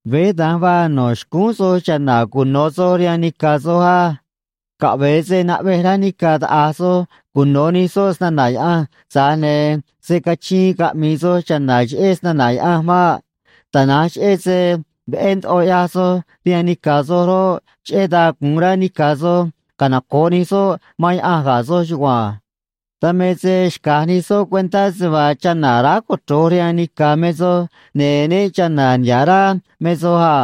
Veé da̱nj vaa no̱ xcúún soj cha̱na̱ cuno̱ soj rihaan nica̱ soj á. Caꞌve̱e se naꞌvej rá nica̱ taꞌa̱j soj cuno̱ nij soꞌ snana̱ Yaꞌanj, tza̱j ne̱ se̱ cachiin caꞌmi̱i̱ soj cha̱na̱ cheꞌé snana̱ Yaꞌanj maꞌ. Tana̱nj cheꞌé se veꞌé ndoꞌo ꞌyaj soj rihaan nica̱ soj roꞌ, cheꞌé dan gu̱un rá nica̱ soj canoco̱ꞌ nij soꞌ man Yaꞌanj ga̱ soj chugua̱nj. Dan me se xca̱j nij soꞌ cuentá se vaa chana̱ aráj cochro̱j rihaan nica̱ me soj, ne̱ né cha̱na̱ niha̱ꞌ rá me soj a.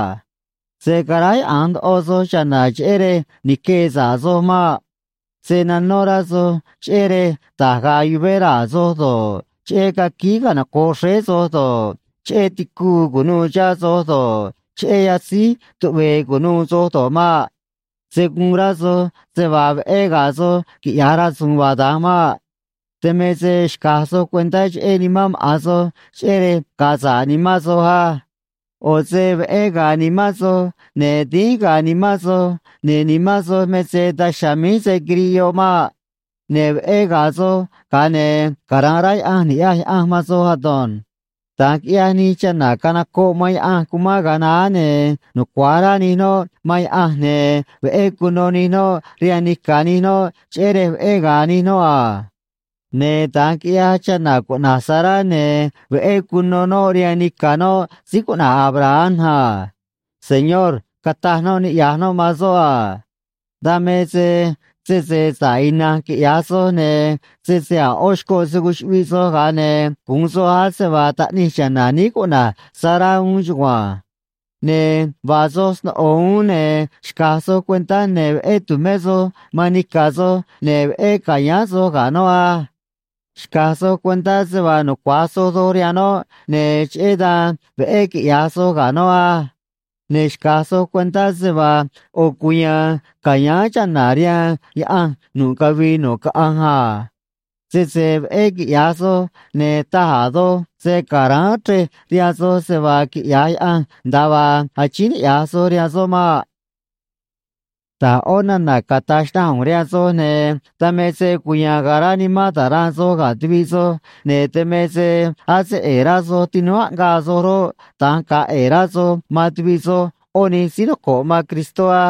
Se̱ caráyaꞌa̱nj ndoꞌo soj cha̱na̱ cheꞌé rej ni̱quee sa̱ꞌ soj maꞌ. Se̱ nanó rá soj cheꞌé rej da̱j ga̱a̱ yuvé raa̱ soj do̱ꞌ, cheꞌé caquíí canoco̱ꞌ xréé soj do̱ꞌ, cheꞌé ticuu cu̱nuû chihá soj do̱ꞌ, cheꞌé yatzíj tuꞌve̱e̱ cu̱nuû soj do̱ꞌ maꞌ. Se̱ guun rá soj se vaa veꞌé ga̱a̱ soj quiꞌya̱j rasu̱u̱n vaa da̱nj maꞌ. Dan me se xca̱j soj cuentá cheꞌé nimán maꞌa̱n soj cheꞌé rej ga̱a̱ sa̱ꞌ nimán soj á. ꞌO̱ se veꞌé ga̱a̱ nimán soj, ne̱ dínj ga̱a̱ nimán soj, ne̱ nimán soj me se daj chiha̱a̱ míj se̱ quiriꞌ yoꞌ maꞌ. Ne̱ veꞌé ga̱a̱ soj, ga̱a ne̱ cara̱nꞌ rá Yaꞌanj ni̱ꞌyaj Yaꞌanj man soj ado̱nj. Da̱nj quiꞌyaj nij chana̱ canocoꞌ man Yaꞌanj cumán ga̱a naá, ne̱ nucua̱j rá nij noꞌ man Yaꞌanj, ne̱ veꞌé cuno nij noꞌ rihaan nica̱ nij noꞌ, cheꞌé rej veꞌé ga̱a̱ nij noꞌ a. Ne̱ da̱nj quiꞌyaj chana̱ cuꞌna̱j Sará, ne̱ veꞌé cuno noꞌ rihaan nica̱ noꞌ síí cuꞌna̱j Abraham a. “Señor”, cataj noꞌ niꞌya̱j noꞌ man soꞌ a. Dan me se sese sa̱ꞌ ina̱nj quiꞌya̱j soj, ne̱ sese a̱ ꞌó xcoꞌ se̱ cuchuꞌviꞌ soj, ga̱a ne̱ gu̱un soj ase vaa taꞌnij cha̱na̱ níí cuꞌna̱j Sará uún chugua̱nj. Ne̱ vaa soj sno̱ꞌo uún, ne̱ xca̱j soj cuentá ne̱ veꞌé tu̱mé soj man nica̱ soj, ne̱ veꞌé ca̱yáán soj ga̱ noꞌ á. Xca̱j soj cuentá se vaa nucua̱j soj doj rihaan noꞌ, ne̱ cheꞌé dan veꞌé quiꞌya̱j soj ga̱ noꞌ á. Ne̱ xca̱j soj cuentá se vaa ꞌo̱ cuya̱a̱n ca̱yáán chana̱ rihaan Yaꞌanj nu̱ꞌ cavii nu̱ꞌ caꞌanj a. Sese veꞌé quiꞌya̱j soj, ne̱ taj a̱ doj se̱ caráán chrej rihaan soj se vaa quiꞌya̱j Yaꞌanj nda̱a vaa achíín niꞌya̱j soj rihaan soꞌ maꞌ. Da̱j ꞌó nana̱ cata̱j xnaꞌanj ꞌu̱nj rihaan soj, ne̱ dan me se cuya̱a̱n ga̱a̱ rá nimán ta̱ranꞌ soj ga̱ tuviꞌ soj, ne̱ dan me se ase ꞌe̱e̱ rá soj tinúú aꞌngaa soj roꞌ, da̱nj ga̱a̱ ꞌe̱e̱ rá soj man tuviꞌ soj ꞌó nij síí noco̱ꞌ man Cristó á.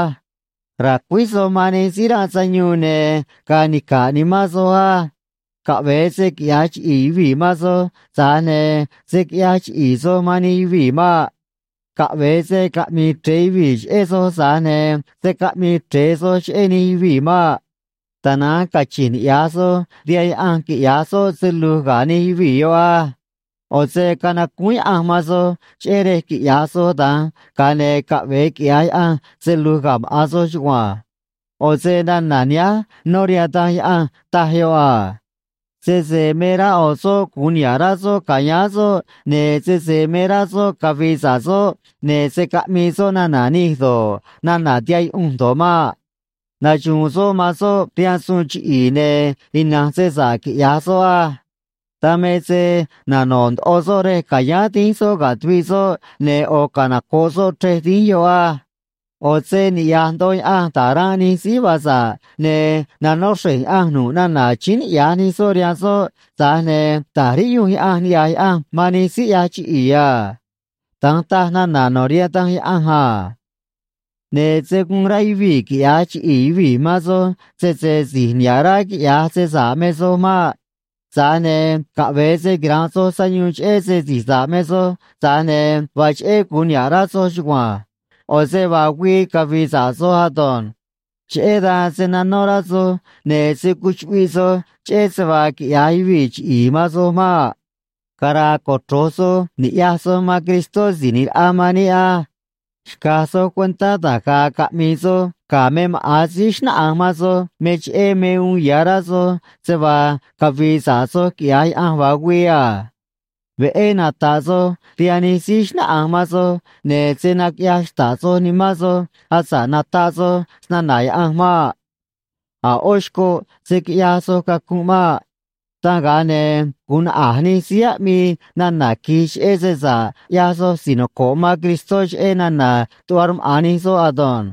Ra̱cuíj soj man nij síí ranꞌ sayuun, ne̱ ga̱a̱ nica̱ꞌ nimán soj á. Caꞌve̱e se quiꞌya̱j chiꞌi̱i̱ yuvii̱ man soj, tza̱j ne̱ se̱ quiꞌyaj chiꞌi̱i̱ soj man nij yuvii̱ maꞌ. Caꞌve̱e se caꞌmi̱i̱ chre̱e yuvii̱ cheꞌé soj, tza̱j ne̱ se̱ caꞌmii chre̱e soj cheꞌé nij yuvii̱ maꞌ. Tana̱nj cachi̱nj niꞌya̱j soj rihaan Yaꞌanj quiꞌya̱j soꞌ se lu̱j ga̱ nij yuvii̱ yoꞌ á. ꞌO̱ se canacúún Yaꞌanj man soj, cheꞌé rej quiꞌya̱j soj da̱nj, ga̱a ne̱ caꞌve̱e quiꞌya̱j Yaꞌanj se lu̱j ga̱ maꞌa̱n soj chugua̱nj. ꞌO̱ se nana̱ nihánj nó rihaan Danj Yaꞌanj, taj yoꞌ a: Sese me rá ꞌo̱ soꞌ gu̱un niha̱ꞌ rá soꞌ ca̱yáán soꞌ, ne̱ sese me rá soꞌ cavi̱i̱ sa̱ꞌ soꞌ, ne̱ se̱ caꞌmii soꞌ nana̱ nij do̱ꞌ, nana̱ tihaꞌ yuꞌunj do̱ꞌ maꞌ. Naxu̱u̱n soꞌ man soꞌ rihaan suun chiꞌi̱i̱, ne̱ ina̱nj se sa̱ꞌ quiꞌya̱j soꞌ á. Dan me se nano̱ꞌ ndoꞌo soꞌ rej ca̱yáán dínj soꞌ ga̱ tuviꞌ soꞌ, ne̱ ꞌo̱ canoco̱ꞌ soꞌ chrej dínj yoꞌ á. ꞌO̱ se niꞌya̱j ndoꞌo Yaꞌanj da̱j ranꞌ nij síí vaa sa̱ꞌ, ne̱ nanó xre̱j Yaꞌanj nu̱ꞌ nana̱ achíín niꞌya̱j nij soꞌ rihaan soꞌ, tza̱j ne̱ ta̱j riꞌyunj Yaꞌanj niꞌya̱j Yaꞌanj man nij síí ꞌyaj chiꞌi̱i̱ a. Da̱nj taj nana̱ no̱ rihaan Danj Yaꞌanj a. Ne̱ se̱ guun rá yuvii̱ quiꞌya̱j chiꞌi̱i̱ yuvii̱ man soj, sese si̱j niha̱ꞌ rá quiꞌya̱j se sa̱ꞌ me soj maꞌ. Tza̱j ne̱ caꞌve̱e se quira̱nꞌ soj sayuun cheꞌé se si̱j sa̱ꞌ me soj, tza̱j ne̱ vaa cheꞌé gu̱un niha̱ꞌ rá soj chugua̱nj. ꞌO̱ se vaa güii cavi̱i̱ sa̱ꞌ soj ado̱nj. Cheꞌé dan se̱ nanó rá soj, ne̱ se̱ cuchuꞌviꞌ soj cheꞌé se vaa quiꞌya̱j yuvii̱ chiꞌi̱i̱ man soj maꞌ. Cara̱a̱ cochro̱j soj ni̱ꞌyaj soj man Cristó Si̱j ꞌNi̱j Raꞌa man níꞌ á. Xca̱j soj cuentá da̱j ga̱a̱ caꞌmi̱i̱ soj ga̱ me maꞌa̱n síí xnáꞌanj man soj me cheꞌé me uun ya̱ rá soj se vaa cavi̱i̱ sa̱ꞌ soj quiꞌya̱j Yaꞌanj vaa güii a. Veꞌé nata̱ꞌ soj rihaan nij síí xnáꞌanj man soj, ne̱ se̱ naquiꞌyaj xta̱ꞌ soj nimán soj asa̱ꞌ nataꞌ soj snana̱ Yaꞌanj maꞌ. A̱ ꞌó xcoꞌ se̱ quiꞌyaj soj cacunꞌ maꞌ. Dan ga̱a ne̱ gu̱un naꞌa̱j nij síí aꞌmii nana̱ qui̱j cheꞌé se sa̱ꞌ ꞌyaj soj si̱j noco̱ꞌ man Cristó, cheꞌé nana̱ tuꞌva rmaꞌa̱n nij soꞌ ado̱nj.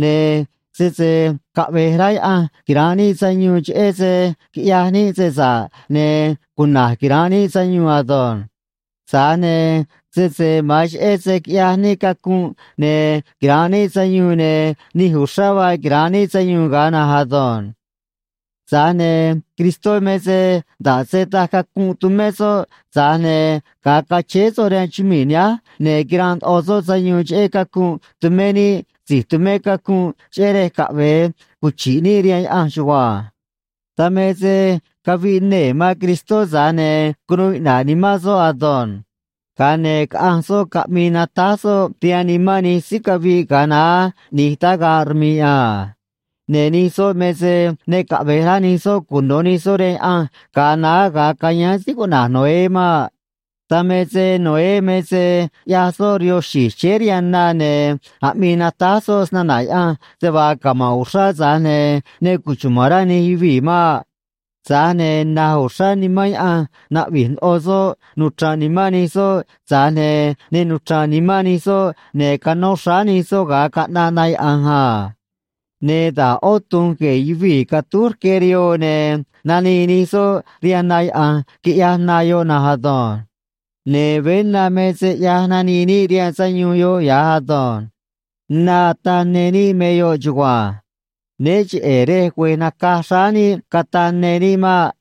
Ne̱ sese caꞌve̱j rá Yaꞌanj quira̱nꞌ níꞌ sayuun cheꞌé se quiꞌyaj níꞌ se sa̱ꞌ, ne̱ cuna̱j quira̱nꞌ níꞌ sayuun ado̱nj. Tza̱j ne̱ sese ma̱an cheꞌé se quiꞌyaj níꞌ cacunꞌ ne̱ quira̱nꞌ níꞌ sayuun, ne̱ nij uxrá vaa quira̱nꞌ níꞌ sayuun ga̱a na̱nj ado̱nj. Tza̱j ne̱ Cristó me se nda̱ꞌ se taj cacunꞌ tumé soꞌ, tza̱j ne̱ ga̱a cachéé soꞌ rihaan chumii̱ nihánj, ne̱ quiranꞌ ndoꞌo soꞌ sayuun cheꞌé cacunꞌ tumé níꞌ si̱j tumé cacunꞌ, cheꞌé rej caꞌve̱e cuchi̱ꞌ níꞌ rihaan Yaꞌanj chugua̱nj. Dan me se caviꞌ nee̱ man Cristó, tza̱j ne̱ cunuu iꞌna̱ꞌ nimán soꞌ ado̱nj. Ga̱a ne̱ caꞌanj soꞌ caꞌmi̱i̱ natáj soꞌ rihaan nimán nij síí caviꞌ ga̱a naá ꞌni̱j tagaꞌ rmi̱ꞌ a. Ne̱ nij soꞌ me se ne caꞌve̱j rá nij soꞌ cuno̱ nij soꞌ rihaan Yaꞌanj ga̱a naá ga̱a cayáán síí cuꞌna̱j Noé maꞌ. Dan me se Noé me se ꞌyaj soꞌ rihoo xi̱j chéé rihaan na ne̱ aꞌmii natáj soꞌ snana̱ Yaꞌanj se vaa cama̱nꞌ uxrá, tza̱j ne̱ ne cuchuma̱n rá nij yuvii̱ maꞌ. Tza̱j ne̱ naj uxrá nimán Yaꞌanj naꞌvi̱j ndoꞌo soꞌ nuchra̱nꞌ nimán nij soꞌ, tza̱j ne̱ ne nuchra̱nꞌ nimán nij soꞌ, ne̱ canó xráá nij soꞌ ga̱a caꞌnaꞌ na yaꞌa̱nj a. Ne̱ da̱j ꞌó tu̱nj gue̱e̱ yuvii̱ catúj rque rihoo, ne̱ nanii nij soꞌ rihaan na yaꞌa̱nj, quiꞌyaj na yoꞌ na̱nj ado̱nj. Ne̱ veé na me se ꞌyaj nanii níꞌ rihaan sayuun yoꞌ ya̱j ado̱nj. Na ataꞌ ne níꞌ me yoꞌ chugua̱nj. Né cheꞌe̱ rej güe̱j nacaj xráá níꞌ cataꞌ ne níꞌ maꞌ.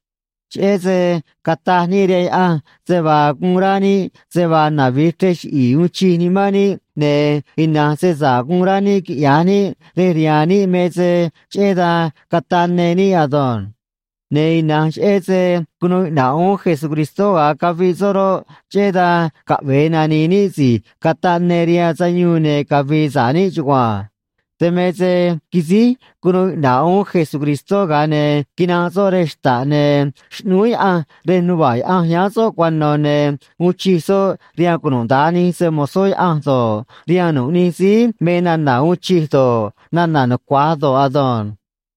Cheꞌé se cataj níꞌ rihaan Yaꞌanj se vaa guun rá níꞌ se vaa navi̱j chrej chiꞌi̱i̱ uun chij nimán níꞌ ne̱ ina̱nj se sa̱ꞌ guun rá níꞌ quiꞌya̱j níꞌ rej rihaan níꞌ me se cheꞌé dan cataꞌ ne níꞌ ado̱nj. Ne̱ ina̱nj cheꞌé se cunuu iꞌna̱ꞌ uún Jesucristó ga̱a caviꞌ soꞌ roꞌ, cheꞌé dan caꞌve̱e nani̱i̱ níꞌ si̱j cataꞌ ne rihaan sayuun ne̱ cavi̱i̱ sa̱ꞌ níꞌ chugua̱nj. Dan me se quisíj cunuu iꞌna̱ꞌ uún Jesucristó, ga̱a ne̱ quinanꞌ soꞌ rej xta̱ꞌ, ne̱ xꞌnúú Yaꞌanj rej nuva̱ꞌ Yaꞌanj yáán soꞌ cuano̱, ne̱ uun chij soꞌ rihaan cunuda̱nj nij se‑mo̱zó Yaꞌanj do̱ꞌ, rihaan nu̱ꞌ nij síí me nana̱ uun chij do̱ꞌ, nana̱ nucua̱j do̱ꞌ ado̱nj.